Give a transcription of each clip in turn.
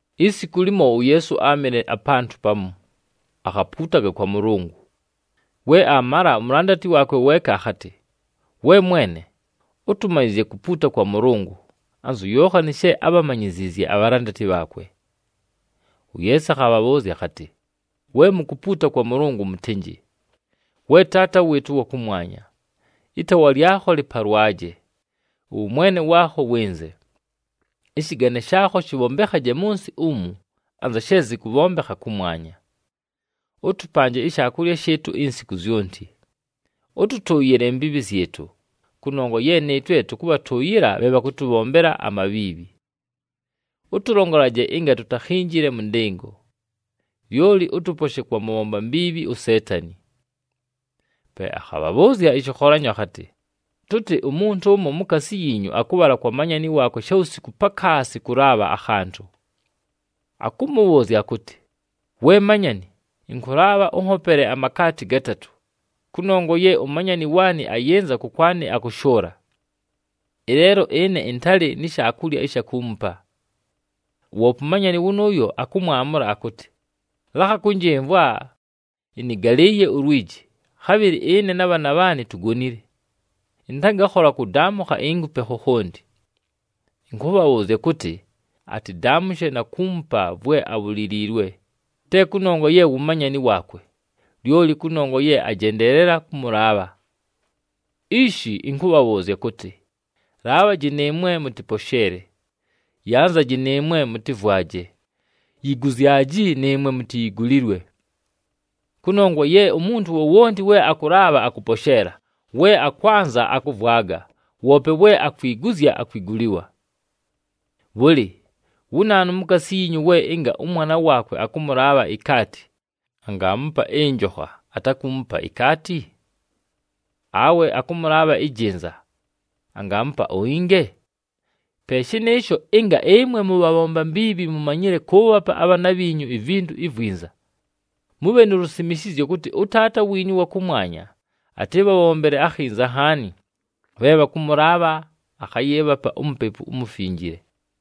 Isiku limo, uYeesu áamɨle apantʉ pamu, akhapuutaga kwa Mʉlʉngʉ. We aamala, umulandati waakwe weeka akhatɨ, “We Mwene, ʉtʉmanyɨzye kupuuta kwa Mʉlʉngʉ, anzu Yookhani she ábhamanyiziizye abhalandati bhaakwe.” UYeesu akhabhabhʉʉzya akhatɨ, “We mukupuuta kwa Mʉlʉngʉ, mʉtɨnjɨ: ‘We Taata [wɨɨtʉ ʉwa kʉmwanya], ɨtaawa lyakho lɨpalwaje. Ʉwʉmwene waakho wɨnze. [Ɨshɨgane shaakho shɨbhombekhaje mʉ nsɨ umu, anza she zɨkʉbhombekha kʉmwanya.] Ʉtʉpanje ishaakulya shɨɨtʉ insiku zyonti. Ʉtʉtʉʉyɨle imbiibhi zyɨtʉ, kʉnongwa ye nɨɨtwe tʉkʉbhatʉʉyɨla bhe bhakʉtʉbhombela amabhiibhi. Ʉtʉlongolaje ɨnga tutakhinjile mʉ ndɨngo, [lyoli ʉtʉposhe kwa mʉbhomba mbiibhi uSeetani].’” Pe akhabhabhʉʉzya ɨshɨkholanyo akhatɨ, “Tʉtɨ umuntu ʉmo mukaasi yiinyu akʉbhala kwa manyani waakwe shawusiku pakaasi, kʉlaabha akhantʉ. Akʉmʉbhʉʉzya akʉtɨ, ‘We manyani, ɨnkʉlaabha ʉnhopele amakaati gatatʉ, kʉnongwa ye umanyani waanɨ ayɨnza kʉkwanɨ akʉshʉʉla, ɨleelo ɨne ɨntalɨ ni shaakulya ɨsha kuumupa.’ Woope umanyani wʉnʉʉyo akʉmwamʉla akʉtɨ, ‘Lakha kʉnjɨmvwa! Ɨnɨgalɨɨye ulwiji, khabhɨlɨ ɨne na bhaana bhaanɨ tugonile. Ɨntangakhola kʉdaamʉkha inkupe khokhonti!’ Ɨnkʉbhabhʉʉzya kʉtɨ, atɨdaamʉshe na kuumupa vwe abhuliliilwe, te kʉnongwa ye wu manyani waakwe, lyoli kʉnongwa ye ajendeelela kʉmʉlaabha. “Ishi ɨnkʉbhabhʉʉzya kʉtɨ, laabhaji nɨɨmwe mʉtɨposheele, yanzaji nɨɨmwe mʉtɨvwaje, yiguzyaji nɨɨmwe mutiyigulilwe. Kʉnongwa ye umuntu wowonti we akʉlaabha, akʉposheela, we akwanza, akʉvwaga, woope we akwiguzya, akwigulilwa. Bhʉlɨ, wu naanu mukaasi yiinyu we ɨnga ʉmwana waakwe akʉmʉlaabha ikaati, angaamupa ɨnjokha, atakuumupa ikaati? Awe akʉmʉlaabha ɨjɨnza, angaamupa uinge? Pe shɨnɨɨsho, ɨnga ɨmwe mʉbhabhomba mbiibhi mumanyile kʉʉbhapa abhaana bhiinyu ivintu ivwinza, mʉbhe nu lusimishizyo kʉtɨ ʉTaata wiinyu ʉwa kʉmwanya atɨbhabhombele akhinza nhaani, bhe bhakʉmʉlaabha akhayɨɨbhapa uMupepu uMufinjile.”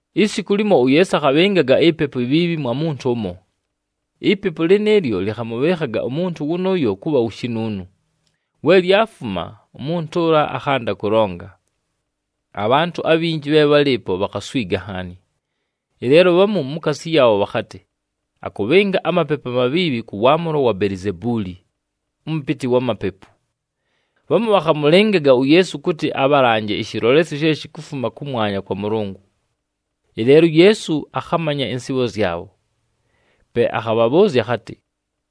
Isiku limo, uYeesu akhabhɨngaga ipepu ibhiibhi mwa muntu ʉmo. Ipepu lɨnɨɨlyo lɨkhamʉbhɨɨkhaga umuntu wʉnʉʉyo kʉbha wu shinuunu, we lyafuma, umuntu ʉla akhanda kʉlonga. Abhantʉ abhinji bhe bhálɨɨpo, bhakhaswiga nhaani. Ɨleelo bhamu mukaasi yaabho bhakhatɨ, “Akʉbhɨnga amapepu amabhiibhi kʉ waamʉlo wa Belizebuuli, ʉmʉpɨtɨ wa mapepu!” Bhamu bhakhamʉlɨngaga uYeesu kʉtɨ abhalanje ɨshɨlolesyo she shikufuma kʉmwanya kwa Mʉlʉngʉ. Ɨleelo uYeesu akhamanya ɨnsɨɨbho zyabho. Pe akhabhabhʉʉzya akhatɨ,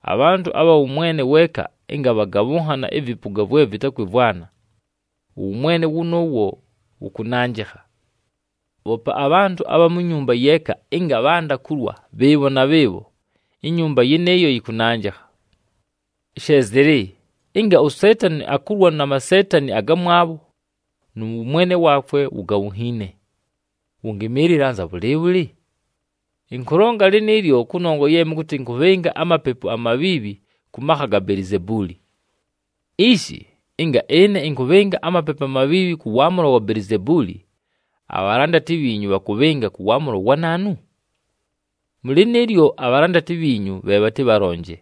“Abhantʉ abha wʉmwene weeka ɨnga bhagabhʉnhana ɨvɨpʉga vwe vɨtakwɨmvwana, ʉwʉmwene wʉnʉʉwo wʉkʉnanjɨkha. Bhoope abhantʉ abha mu nyumba yeeka ɨnga bhanda kulwa bhɨɨbho na bhɨɨbho, inyumba yɨnɨɨyo yɨkʉnanjɨkha. She zɨlɨ, ɨnga uSeetani akulwa na maseetani agamwabho nʉ wʉmwene waakwe wugabhunhiine, wʉngɨmɨɨlɨla anza bhʉlɨɨbhʉlɨ? Ɨnkʉlonga lɨnɨɨlyo kʉnongwa ye mʉkʉtɨ ɨnkʉbhɨnga amapepu amabhiibhi kʉ makha ga Belizebuuli. Ishi, ɨnga ɨne ɨnkʉbhɨnga amapepu amabhiibhi kʉ waamʉlo wa Belizebuuli, abhalandati bhiinyu bhakʉbhɨnga kʉ waamʉlo wa naanu? Mʉ lɨnɨɨlyo, abhalandati bhiinyu bhe bhatɨbhalonje.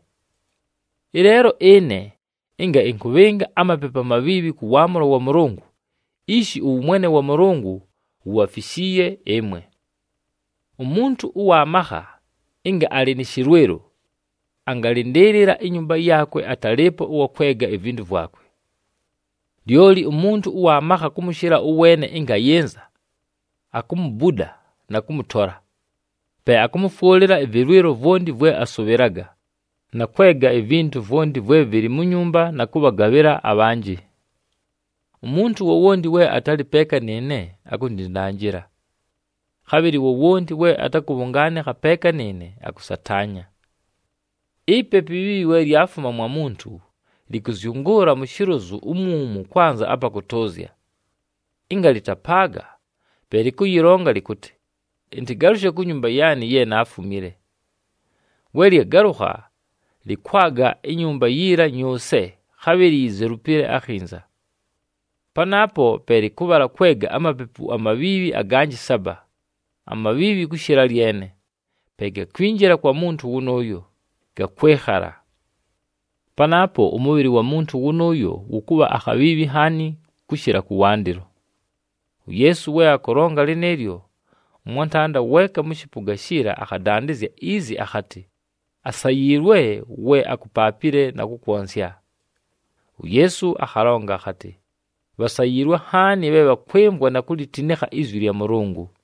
Ɨleelo ɨne, ɨnga ɨnkʉbhɨnga amapepu amabhiibhi kʉ waamʉlo wa Mʉlʉngʉ, ishi ʉwʉmwene wa Mʉlʉngʉ wubhafishiiye ɨmwe! “Umuntu ʉwa makha, ɨnga alɨ nɨ shɨlwɨlo, angalɨndɨɨlɨla inyumba yaakwe, atalɨɨpo ʉwa kwega ivintu vwakwe. Lyoli umuntu ʉwa makha kʉmʉshɨla ʉweene ɨnga ayɨnza, akumubuda na kʉmʉtola. Pe akʉmʉfwʉlɨla ɨvɨlwɨlo vwonti vwe asʉbhɨlaga, na kwega ivintu vwonti vwe vɨlɨ mu nyumba na kʉbhagabhɨla abhanjɨ. Umuntu wowonti we atalɨ peeka nɨɨne akundindanjila. Khabhɨlɨ wowonti we atakʉbhʉngaanɨkha peeka nɨɨne, akʉsataanya. “Ipepu ibhiibhi we lyafuma mwa muntu, lɨkʉzyʉngʉʉla mu shilozu umwumu kwanza apa kʉtʉʉzya. Ɨnga lɨtapaaga, pe lɨkʉyɨlonga lɨkʉtɨ, ‘Ɨntɨgalʉshe ku nyumba yaanɨ ye naafumile.’ We lyagalʉkha, lɨkwaga inyumba yiila nyʉʉse, khabhɨlɨ yizelupile akhinza. Panaapo pe lɨkʉbhala kwega amapepu amabhiibhi aganjɨ saba, amabhiibhi kʉshɨla lyene. Pe gakwinjila kwa muntu wʉnʉʉyo, gakwɨkhala. Panaapo ʉmʉbhɨlɨ wa muntu wʉnʉʉyo wʉkʉbha akhabhiibhi nhaani, kʉshɨla kʉwandɨlo.” UYeesu we akʉlonga lɨnɨɨlyo, ʉmwantanda weeka mʉ shɨpʉga shiila akhadandɨzya izi akhatɨ, “Asayiilwe we akupaapile na kʉkwonsya!” UYeesu akhalonga akhatɨ, “Bhasayiilwe nhaani bhe bhakwɨmvwa na kulitinikha izwi lya Mʉlʉngʉ!”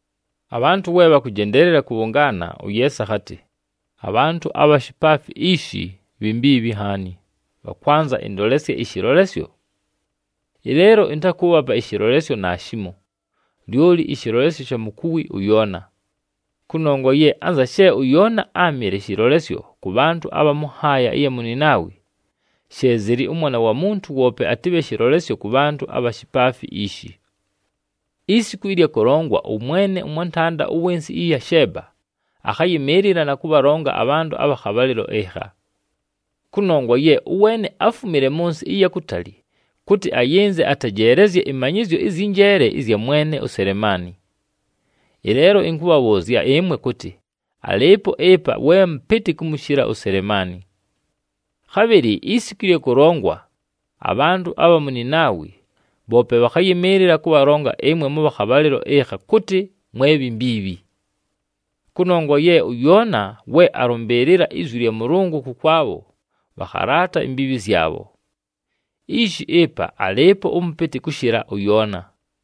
Abhantʉ we bhakʉjendeelela kʉbhʉngaana, uYeesu akhatɨ, “Abhantʉ abha shipaafi ishi, bhi mbiibhi nhaani, bhakwanza ɨndolesye ɨshɨlolesyo! Ɨleelo ɨntakʉʉbhapa ɨshɨlolesyo naashimo, lyoli ɨshɨlolesyo sha mukuwi ʉYoona. Kʉnongwa ye anza she ʉYoona áamɨle shɨlolesyo kʉ bhantʉ abha mʉ nhaaya ɨya mu Ninaawi, she zɨlɨ ʉMwana wa Muntu woope atɨbhe shɨlolesyo kʉ bhantʉ abha shipaafi ishi. Isiku ɨlya kʉlongwa, ʉmwene ʉmwantanda ʉwɨ nsɨ ɨya Sheeba akhayɨmɨɨlɨla na kʉbhalonga abhantʉ abha khabhalɨlo ɨkha. Kʉnongwa ye ʉweene áfumile mʉ nsɨ ɨya kutali kʉtɨ ayɨnze atejeelezye ɨmanyɨzyo ɨzyɨ njeele ɨzya mwene uSelemaani. Ɨleelo ɨnkʉbhabhʉʉzya ɨmwe kʉtɨ alɨɨpo ɨpa we mʉpɨtɨ kʉmʉshɨla uSelemaani. Khabhɨlɨ isiku ɨlya kʉlongwa, abhantʉ abha mu Ninaawi bhoope bhakhayɨmɨɨlɨla kʉbhalonga ɨmwe mʉbha khabhalɨlo ɨkha kʉtɨ mwe bhi mbiibhi. Kʉnongwa ye ʉYoona we alʉmbɨɨlɨla izwi lya Mʉlʉngʉ kʉkwabho, bhakhalaata imbiibhi zyabho. Ishi ɨpa alɨɨpo ʉmʉpɨtɨ kʉshɨla ʉYoona!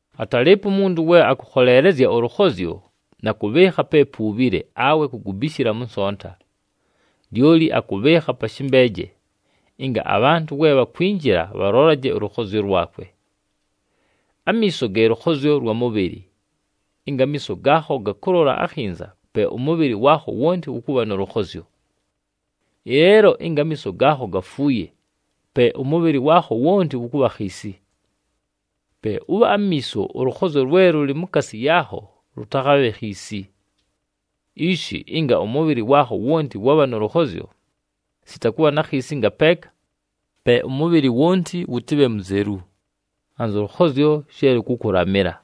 “Atalɨɨpo umuntu we akʉkholeelezya ʉlʉkhozyo, na kʉbhɨɨkha pe puubhile awe kugubishila mʉ nsonta. Lyoli akʉbhɨɨkha pa shɨmbeeje, ɨnga abhantʉ we bhakwinjila, bhalolaje ʉlʉkhozyo lwakwe. Amiiso ge lʉkhozyo lwa mʉbhɨlɨ. Ɨnga amiiso gaakho gakʉlola akhinza, pe ʉmʉbhɨlɨ waakho wonti wʉkʉbha nʉ lʉkhozyo. Ɨleelo ɨnga amiiso gaakho gafuuye, pe ʉmʉbhɨlɨ waakho wonti wʉkʉbha khiisi. Pe ʉbhe amiiso, ʉlʉkhozyo lwe lʉlɨ mukaasi yaakho lʉtakhabhe khiisi. Ishi ɨnga ʉmʉbhɨlɨ waakho wonti wabha nʉ lʉkhozyo, sita kʉbha na khiisi ngapeeka, pe ʉmʉbhɨlɨ wonti wʉtɨbhe muzelu, anzʉ lʉkhozyo she lʉkʉkʉlamɨla.”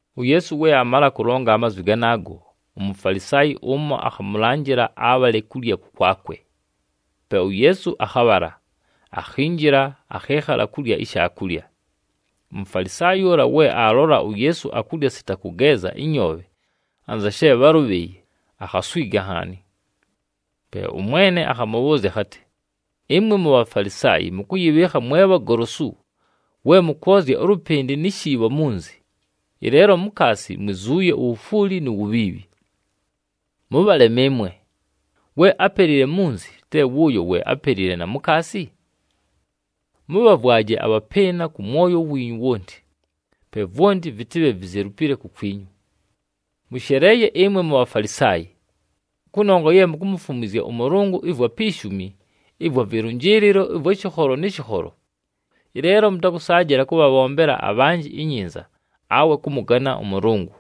UYeesu we aamala kʉlonga amazwi ganaago, uMufalisaayi ʉmo akhamʉlanjɨla abhale kulya kʉkwakwe. Pe uYeesu akhabhala, akhinjila, akhɨɨkhala kulya ishaakulya. UMufalisaayi ʉla we aalola uYeesu akulya sita kʉgeeza ɨnyoobhe anza she bhálʉbhɨɨye, akhaswiga nhaani. Pe ʉMwene akhamʉbhʉʉzya akhatɨ, “Ɨmwe muBhafalisaayi mʉkʉyɨbhɨɨkha mwe bhagolosu, we mʉkwozya ʉlʉpɨndɨ ni shiibho munzi, ɨleelo mukaasi mwizuuye uwufwuli nu wubhiibhi. Mʉbhalema ɨmwe! We ápelile munzi, te wʉʉyo we ápelile na mukaasi? Mʉbhavwaje abhapɨɨna kʉ mwoyo wiinyu wonti, pe vwonti vɨtɨbhe vizelupile kukwinyu. “Mʉsheleeye ɨmwe Bhafalisaayi, kʉnongwa ye mukumufumwizya ʉMʉlʉngʉ ɨvwa pi shumi ɨvwa vɨlʉnjɨɨlɨlo ɨvwa shɨkholo nɨ shɨkholo, ɨleelo mʉtakʉsaajɨla kʉbhabhombela abhanjɨ inyinza awe kʉmʉgana ʉMʉlʉngʉ.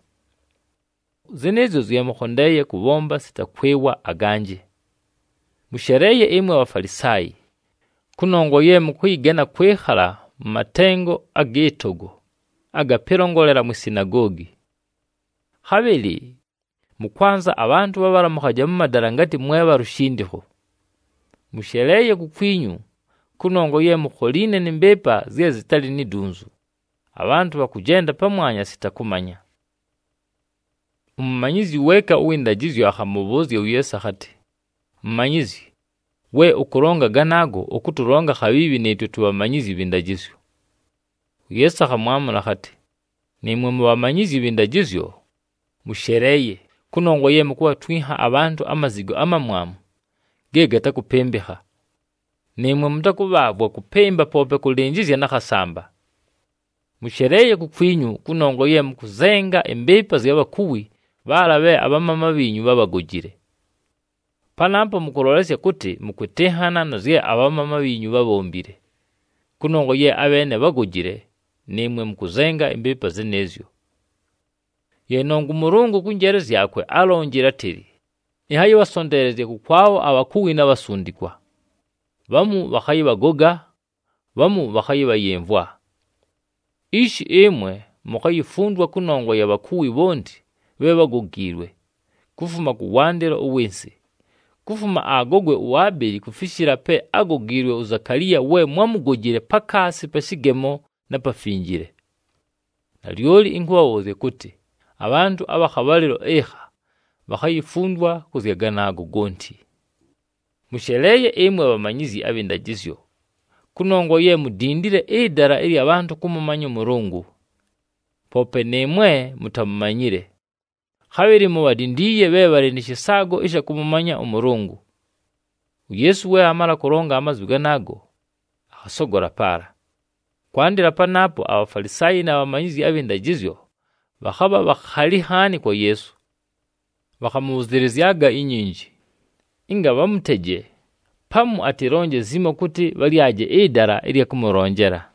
Zɨnɨɨzyo zye mʉkhondeeye kʉbhomba sita kwɨwa aganjɨ. Mʉsheleeye ɨmwe Bhafalisaayi, kʉnongwa ye mʉkʉyɨgana kwɨkhala mʉ matengo agɨ togo aga pɨlongolela mwi sinagoogi. Khabhɨlɨ mʉkwanza abhantʉ bhabhalamʉkhaje mʉ madala ngatɨ mwe bha lushindikho. Mʉsheleeye kukwinyu, kʉnongwa ye mukholiine nɨ mbɨɨpa zye zɨtalɨ ni dunzu, abhantʉ bhakʉjenda pamwanya sita kʉmanya.” Umumanyizyi weeka ʉwɨ ndajɨzyo akhamʉbhʉʉzya uYeesu akhatɨ, “Mumanyizyi, we ʉkʉlonga ganaago, ʉkʉtʉlonga khabhiibhi nɨɨtwe tubhamanyizyi bhɨ ndajɨzyo.” UYeesu akhamwamʉla akhatɨ, “Nɨɨmwe mubhamanyizyi bhɨ ndajɨzyo, mʉsheleeye, kʉnongwa ye mukubhatwinha abhantʉ amazigo amamwamu ge gatakʉpɨmbɨkha. Nɨɨmwe mʉtakʉbhaavwa kʉpɨmba poope kʉlɨnjɨzya na khasamba! “Mʉsheleeye kukwinyu, kʉnongwa ye mʉkʉzenga ɨmbɨɨpa zya bhakuwi bhaala bhe abhamaama bhiinyu bhábhagojile! Panaapo mʉkʉlolesya kʉtɨ, mʉkwɨtɨnhana na zye abhamaama bhiinyu bhábhombile, kʉnongwa ye abheene bhágojile, nɨɨmwe mʉkʉzenga ɨmbɨɨpa zɨnɨɨzyo! “Ye nongwa ʉMʉlʉngʉ kʉ njeele zyakwe álonjile átɨlɨ, ‘Ɨnhayɨbhasonteelezya kʉkwabho abhakuwi na bhasundikwa, bhamu bhakhayɨbhagoga, bhamu bhakhayɨbhayɨmvwa.’ Ishi, ɨmwe mukhayifundwa kʉnongwa ya bhakuwi bhonti bhe bhágogiilwe, kufuma kʉwandɨlo ʉwɨ nsɨ, kufuma agogwe uAbeli kufishila pe ágogiilwe uZakaliya, we mwámugojile pakaasi pa shɨgemo na Pafinjile. Nalyoli ɨnkʉbhabhʉʉzya kʉtɨ, abhantʉ abha khabhalɨlo ɨkha bhakhayifundwa kʉ zya ganaago gonti. “Mʉsheleeye ɨmwe bhamanyizyi abhɨ ndajɨzyo, kʉnongwa ye mudindile ɨdala ɨlya bhantʉ kʉmʉmanya ʉMʉlʉngʉ. Poope nɨɨmwe mutamumanyile, khabhɨlɨ mubhadindiiye bhe bhalɨ nɨ shɨsaago ɨsha kʉmʉmanya ʉMʉlʉngʉ.” UYeesu we aamala kʉlonga amazwi ganaago, akhasogola paala. Kwandɨla panaapo aBhafalisaayi na bhamanyizyi abhɨ ndajɨzyo bhakhabha bhakhali nhaani kwa Yeesu. Bhakhamʉbhʉzɨlɨzyaga inyinji, ɨnga bhamʉteje, pamu atɨlonje zimo kʉtɨ bhalyaje ɨdala ɨlya kʉmʉlonjela.